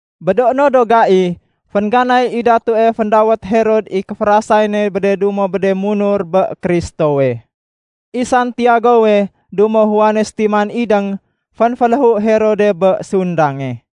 Bé do no do gai, féngganay i datue féndawét Herod i kéférasay ne bé de dumo bé de munur bé Kristowe. I Santiagowe dumo Juane sétiman idéng, fénféléhu Herode bé sundange.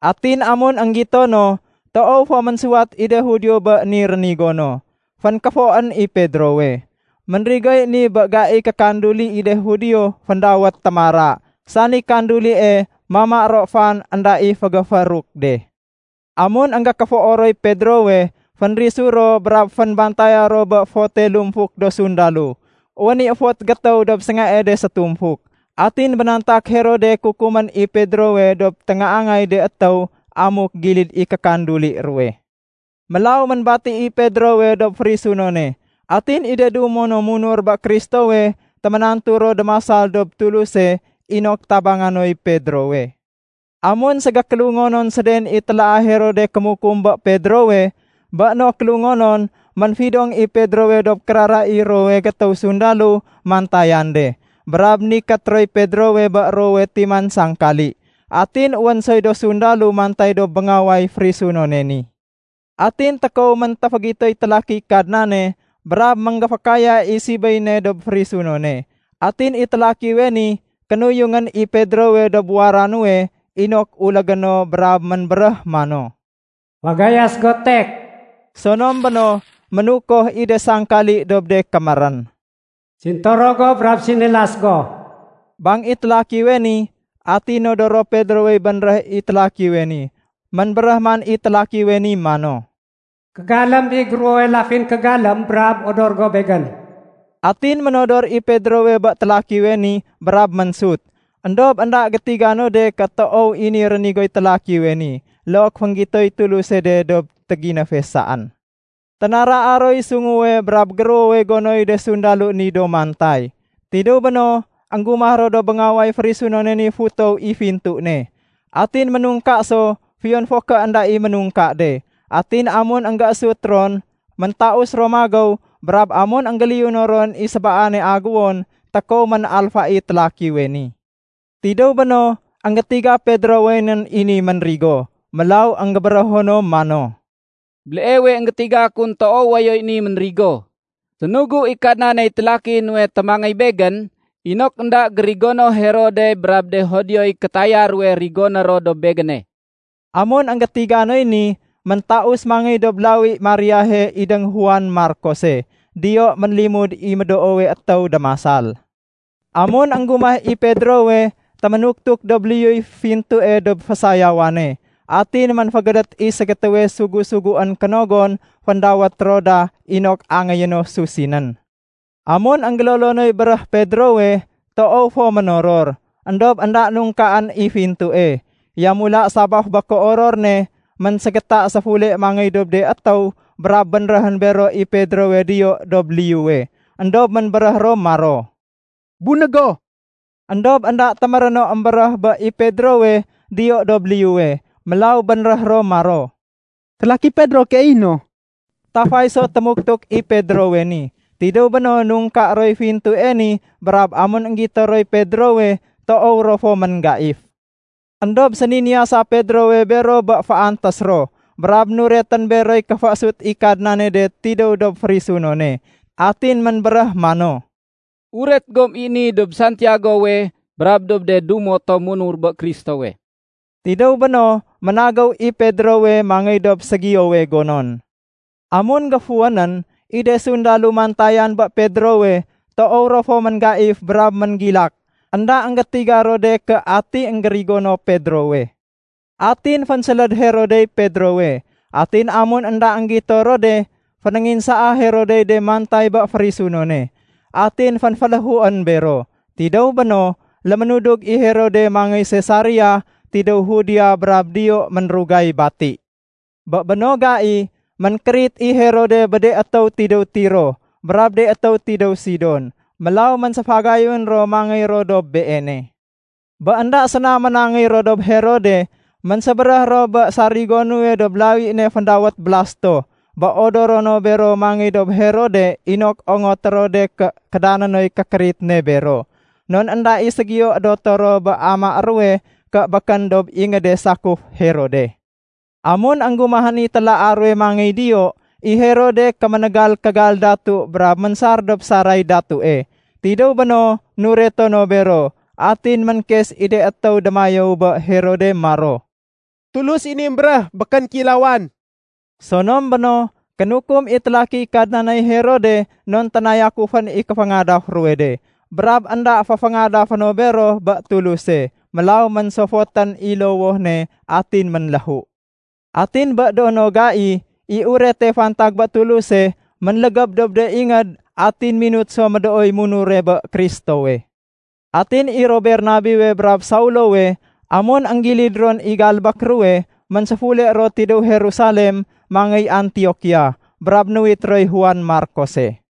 Atin amun énggito no toow fo ménsuwat i de Judio bé ni rénigo no, fénkéfoén i Pedrowe. (Ménrigoy ni bé gaiy kékanduli i de Judio féndawét “Témara”, sani kandulie mama ro fan énda i fégéféruk de.) Amun énggékéfoo roy Pedrowe, fénrisu ro brab fénbantaya ro bé fote lumfuk do sundalo. Wén i fot gétéw dob séngae de sétumfuk. Atin bénantak Herode kukumén i Pedrowe dob téngaangay de étéw amuk gilid i kékanduli ruwe. Mélaw ménbati i Pedrowe dob férisunone. Atin i de dumo no munur bé Kristowe téménantu ro démasal dob Tuluse inok tabanga noy Pedrowe. Amun ségékélungonon séden i télaa Herode kémukum bé Pedrowe, bé no kélungonon ménfidong i Pedrowe dob kérara i ruwowe gétéw sundalo mantayan de. Brab nikét roy Pedrowe bé ruwowe timan sangkali. Atin wén soy do sundalo mantay dob béngaway férisunone ni. Atin tékow méntéfégitoy télakiy Kadnane brab ménggéfékaya i sibéy ne dob férisunone. Atin i télakiwe ni kénuyungén i Pedrowe dob wara nuwe inok ulégé no brab ménbéréh mano, “Fagayas go tek!” Sonom béno ménukoh i de sangkali dob de kémérén. “Sintoro go brab sinilas go”, bang i télakiwe ni. Atin nodoro Pedrowey bénréh i télakiwe ni. Ménbéréh man i télakiwe ni mano, “Kégalém i géruwowe lafin kégalém brab odor go begén.” Atin ménodor i Pedrowe bé télakiwe ni brab ménsut. Endob énda gétiga no de ké toow i ni rénigoy télakiwe ni, look fénggitoy Tuluse de dob téginéfe saén. Ténaraa roy sunguwe brab géruwowe gonoy de sundalo ni do mantay. Tidéw béno, énggumah ro dob béngaway férisunone ni futow i fintu ne. Atin ménungka so fiyon fo ké énda i ménungka de. Atin amun énggésut ron, méntaus ro magéw brab amun énggéliyuno ron i sébaane aguwon, tékow ménalfa i télakiwe ni. Tidéw béno énggétiga Pedrowe nén i ni ménrigo, mélaw énggébérého no mano, “Béleewe énggétiga kun toow wayoy ni ménrigo! Sénugu i Kadnaney télaki nuwe témangéy begén inok énda gérigono Herode brab de Judioy kétaya ruwe rigoné ro dob begéne.” Amun énggétiga noy ni, méntaus mangéy dob lawi Mariahe idéng Juan Markose. Diyo ménlimud i médoowe étéw démasal. Amun énggumah i Pedrowe, téménuktuk dob liyuy fintue dob fésayawane. Atin ménfégédét i ségétéwe sugu-suguén kénogon féndawét Roda inok angéyé no susinén. Amun énggélolo noy béréh Pedrowe, toow fo ménoror. Endob énda nungkaén i fintue. Yamula sabaf bé kéoror ne ménségéta séfule mangéy dob de étéw brab bénréhén bero i Pedrowe diyo dob liyuwe. Endob ménbéréh ro maro, “Bunég go!” Endob énda téméré no émbéréh bé i Pedrowe diyo dob liyuwe. Mélaw bénréh ro maro, “Télaki Pedro keey i no.” Tafay so témuktuk i Pedrowe ni. Tidéw béno nungka roy fintue ni brab amun énggito roy Pedrowe, toow ro fo ménggaif. Endob séniniyasa Pedrowe bero bé féantés ro, brab nuretén beroy kéféésut i Kadnane de tidéw dob férisunone. Atin ménbéréh mano, “Uret gom i ni dob Santiagowe brab dob de dumo tom munur bé Kristowe.” Tidéw béno, ménagéw i Pedrowe mangéy dob ségiyowe gonon. Amun géfuwénén, i de sundalo mantayan bé Pedrowe, toow ro fo ménggaif brab ménggilak. Enda énggétiga ro de ké ati énggérigono Pedrowe. Atin fénséléd Herodey Pedrowe. Atin amun énda énggito ro de, fénénginsaa Herodey de mantay bé férisunone, atin fénféléhuén bero. Tidéw béno, léménudug i Herode mangéy Sesaria tidéw Judea brab diyo ménrugay bati. Bé béno gai, ménkérit i Herode bé de étéw tidéw Tiro brab de étéw tidéw Sidon. Mélaw ménséfagayun ro mangéy ro dob beene. Bé énda séna ménangéy ro dob Herode, ménsébéréh ro bé sarigo nuwe dob lawi ne féndawét Blasto bé odoro no bero mangéy dob Herode inok ongoté ro de ké kédané noy kékérit ne bero. Non énda i ségiyo édoto ro bé amaé ruwe ké békén dob ingéde sakuf Herode. Amun énggumahén i télaa ruwe mangéy diyo, i Herode kéménégal kégal datu brab ménsar dob saray datue. Tidéw béno nureto no bero. Atin ménkes i de étéw démayéw bé Herod maro, “Tulus i ni émbéréh, békén kéilawan.” Sonom béno, kénukum i télakiy Kadnaney Herode non ténayakufén i kéféngadaf ruwe de, brab énda féféngadafé no bero bé Tuluse. Mélaw ménsofotén i lowoh ne atin ménléhu. Atin bé do no gai, i urete fantag bé Tuluse ménlégéb dob de ingéd atin minut so médooy munure bé Kristowe. Atin i ro Bernabewe brab Saulowe amun énggilid ron i galbék ruwe, ménséfule ro tidéw Jerusalem mangéy Antiokia, brab nuwit roy Juan Markose.